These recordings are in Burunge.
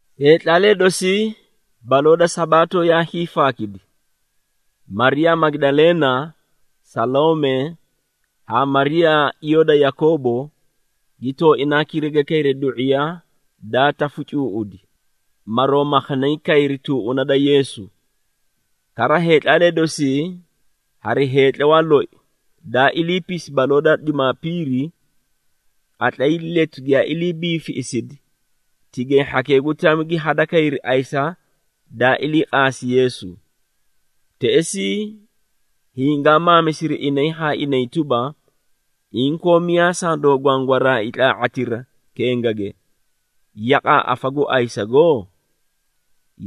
Heetlaalee dosii, baloo da Sabaato yaa hiifaakidi. Mariyaa Magidaleena, Saloome haa Mariyaa iyoo da Yakoobo gi tooinaa kiriga kayri du⁄iya daa tafu cuuꞌudi, maroo maakhanay kayri tuuꞌuna da Yeesu. Kara heetlaalee dosii hari heetlawaa loi, daa iliipisi baloo da Jumaapiiri, qatlay letu giyaa ilii biifiꞌisidi, tigay hhakee gu tami gi hadakayri ayisa daa ilii qaasi Yeesu. Teꞌesii hingaa maamisiri inay haa inay tuba, “Inkoo miyaa sandoo gwangwaraai tlaa⁄atira kengage, yaqaa afa gu ayisago?”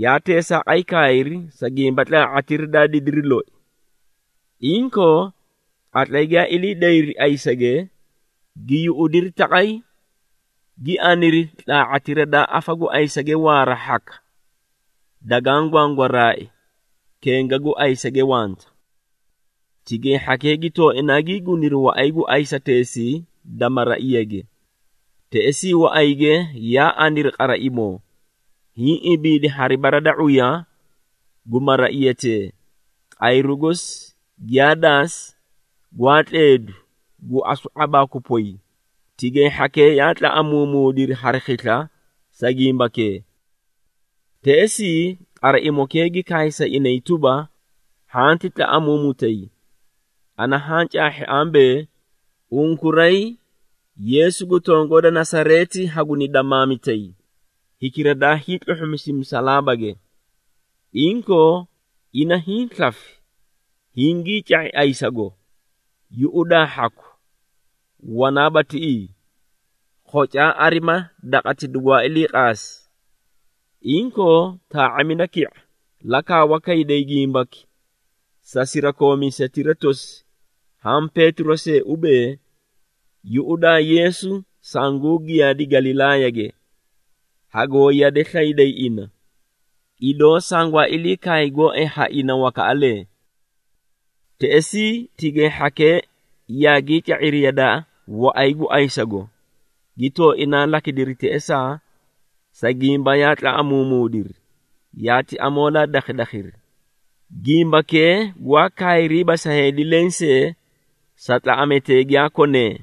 Yaa teesaaqay kaayri, sa gimba tlaa⁄atira daa didiri loi. Inkoo, qatlay giyaa ilii dayri ayisage, gi yuꞌudiri taqay, gi aniri, tlaa⁄atira daa afa gu ayisage waara hhaka, dagaã gwangwaraai, kenga gu ayisage wanta. Tigay hhakee gi tooinaa gii guniri waꞌay gu ayisateesii da maraiyage, teꞌesii waꞌayge yaa aniri qaraimoo, hiĩ ibiidi hari bara da ⁄uya gu maraiyatee, qayru gosi giyaa daasi, gwaa tleedu, gu asu ⁄abaaku poy, tigay hhakee yaa tlaꞌamuumuudiri hari khisla sa gimbakee. Teꞌesii qaraimokee gi kaay sa inay tuba, “Hhanti tlaꞌamuumutay! Ana haã caahhi ambee, unkuray Yeesu gu tongoo da Nasareeti haguni damaamitay, hikira daa hiitluhhumisi musalaabage. Inkoo ina hiĩ slafi, hingii ca⁄i ayisago! Yuꞌudaa hhaku, wanaaba tiꞌii. Khocaa arima daqati dugwaa ilii qaasi. Inkoo taa⁄amida ki⁄a, la kaawa kayday gimbaki sa sirakoomiisetira tosi haã Peetiro see ubee, ‘Yuꞌudaa, Yeesu sangu giyaadi Galilaayage. Hagoo yade slayday ina, idoo sangwaa ilii kaay gooay ha ina wakaꞌalee.’” Teꞌesii tigay hhakee yaagii ca⁄iri yadaa waꞌay gu ayisago, gi tooinaa lakidiri teꞌesaa, sa gimba yaa tlaꞌamuumuudiri, yaati amoolaa dakhadakhiri. Gimbakee gwaa kaayriiba sa heedi lensee sa tlaꞌametee giyaa konee. [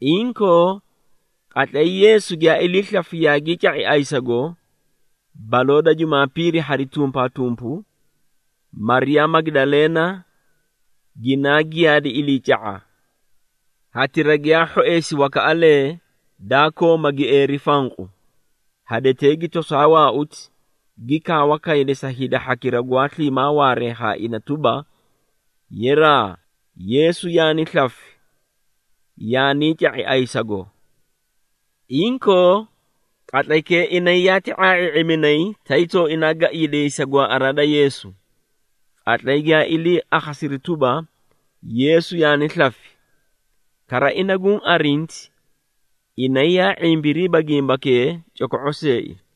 Inkoo qatlay Yeesu giyaa ilii slafi yaagii ca⁄i ayisago, baloo da Jumaapiiri hari tumpaatumpu, Mariyaa Magidaleena, ginaa giyaadi iliica⁄a, hatira giyaa hhoeesi wakaꞌalee, daa kooma gieeri fanqu. Hadetee gi tosaa waauti, gi kaawa kaydi sa hida hhakira gwaa sliimaa waaree haa ina tuba, “Yeraa! Yeesu yaani slafi, yaanii ca⁄i ayisago!” Inkoo qatlaykee inay yaati ⁄aa⁄ii⁄iminay, tay tooinaa gaiidiyay sa gwaaꞌaraa da Yeesu. Qatlay giyaa ilii akhasiri tuba, Yeesu yaani slafi, kara ina guũ arinti, inay yaa ⁄imbiriiba gimbakee coko⁄o seei.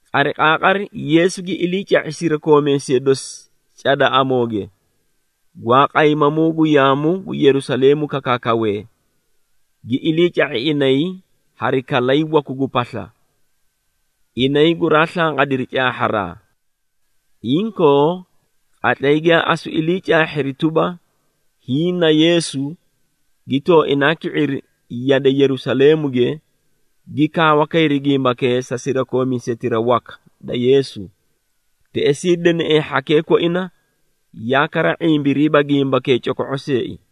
Qariqaaqari Yeesu gi iliica⁄i sirakoomiisee dosi cada amooge, gwaa qaymamuu gu yaamu gu Yerusaleemu kakaakawee, gi iliica⁄i inay hari kalay waku gu pasla, inay guraa slanqadiri caahharaa. Inkoo qatlay giyaa asu ilii caahhiri tuba, hiĩ na Yeesu, gi tooinaa ki⁄iri yade Yerusaleemuge, gi kaawa kayri gimbakee sa sirakoomiisetira waka da Yeesu, teꞌesii deneꞌee hhakee koina yaa kara ⁄imbiriiba gimbakee coko⁄o seei.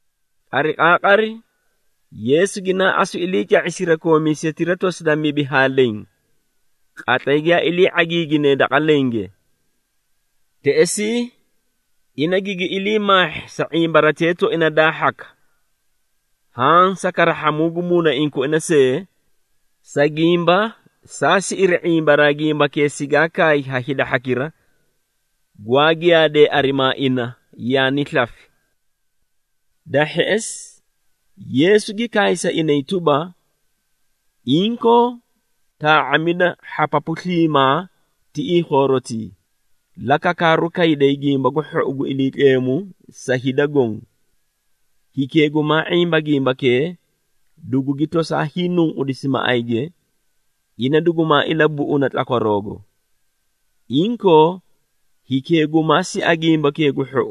Qariqaaqari, Yeesu ginaa asu iliica⁄i sirakoomiisetira tosi da mibi haa leẽ, qatlay giyaa ilii ⁄agiiginee daqa lenge. Teꞌesii ina gigi ilii maahhi sa ⁄imbaratee tooina daa hhaka, haã sa karahhamuu gu muunaiĩ koina see, sa gimba saa siꞌiri ⁄imbaraa gimbakee sigaa kaay ha hida hhakira, gwaa giyaadee arimaa ina, yaani slafi. Da hheꞌesi Yeesu gi kaay sa inay tuba, “Inkoo taa⁄amida hhapapu sliimaa tiꞌii khoorotii, la kakaaru kayday Gimba gu Hhou gu Iliitleemu sa hida goõ. Hikee gumaa ⁄imba gimbakee, dugugi tosaa hiinunqudisi maꞌayge, ina dugumaa ilabuꞌuna tlakwaroogo. Inkoo hikee gumaa sia Gimbakee gu Hhou,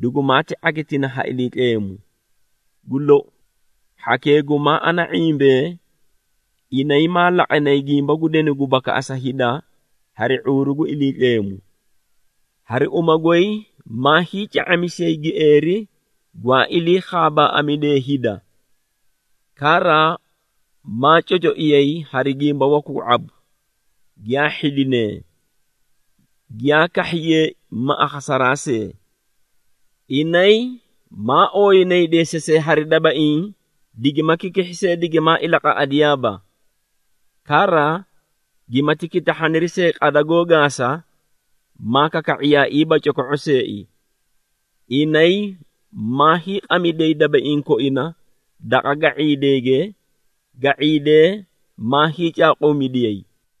dugumaati ⁄agitina ha Iliitleemu. Gu lou, hhakee gumaa ana ⁄imbee, inay maa laqanay gimba gu denu gu bakaꞌasa hida hari ⁄uuru gu Iliitleemu. Hari uma goy maa hiica⁄amisiyay gieeri gwaa ilii khaabaaꞌamidiyee hida. Kara maa cocoiyay hari gimba waku gu ⁄abu, giyaa hhidinee, giyaa kahhiyee ma akhasaraa see. Inay maa ooyinay deesasee hari dabaiĩ digima kikihhi see, digimaa ilaqaꞌadiyaaba. Kara gimati kitahhaniri see qada goó gaasa, maa kaka⁄iyaaiiba coko⁄o seei. Inay maa hiiqamidiyay dabaiĩ koina daqa ga⁄iideege, ga⁄iidee maa hiicaaquumidiyay.”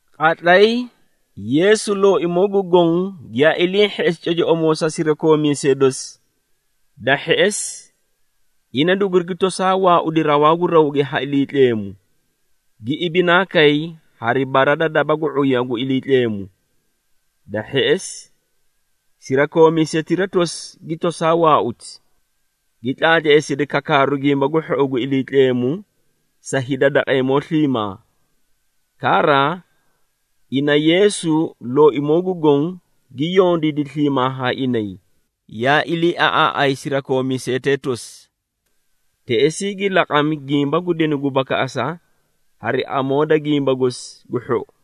Qatlay Yeesu Looimoo gu Goõ giyaa ilii hheꞌesi cocoꞌomoo sa sirakoomiisee dosi, da hheꞌesi ina dugurigi tosaa waaudi rawaa gu rawge ha Iliitleemu, gi ibinaa kay hari bara da daba gu ⁄uya gu Iliitleemu. Da hheꞌesi sirakoomiisetira tosi gi toosaa waauti, gi tlaatleesidi kakaaru Gimba gu Hhou gu Iliitleemu sa hida daqeemoo sliimaa. Kara, ina Yeesu Looimoo gu Goõ gi yondiidi sliimaa haa inay, yaa iliiaꞌaaꞌay sirakoomiisetee tosi. Teꞌesii, ina gi laqaaqami gimba gu denu gu bakaꞌasa hari amoo da Gimba gosi gu Hhou.]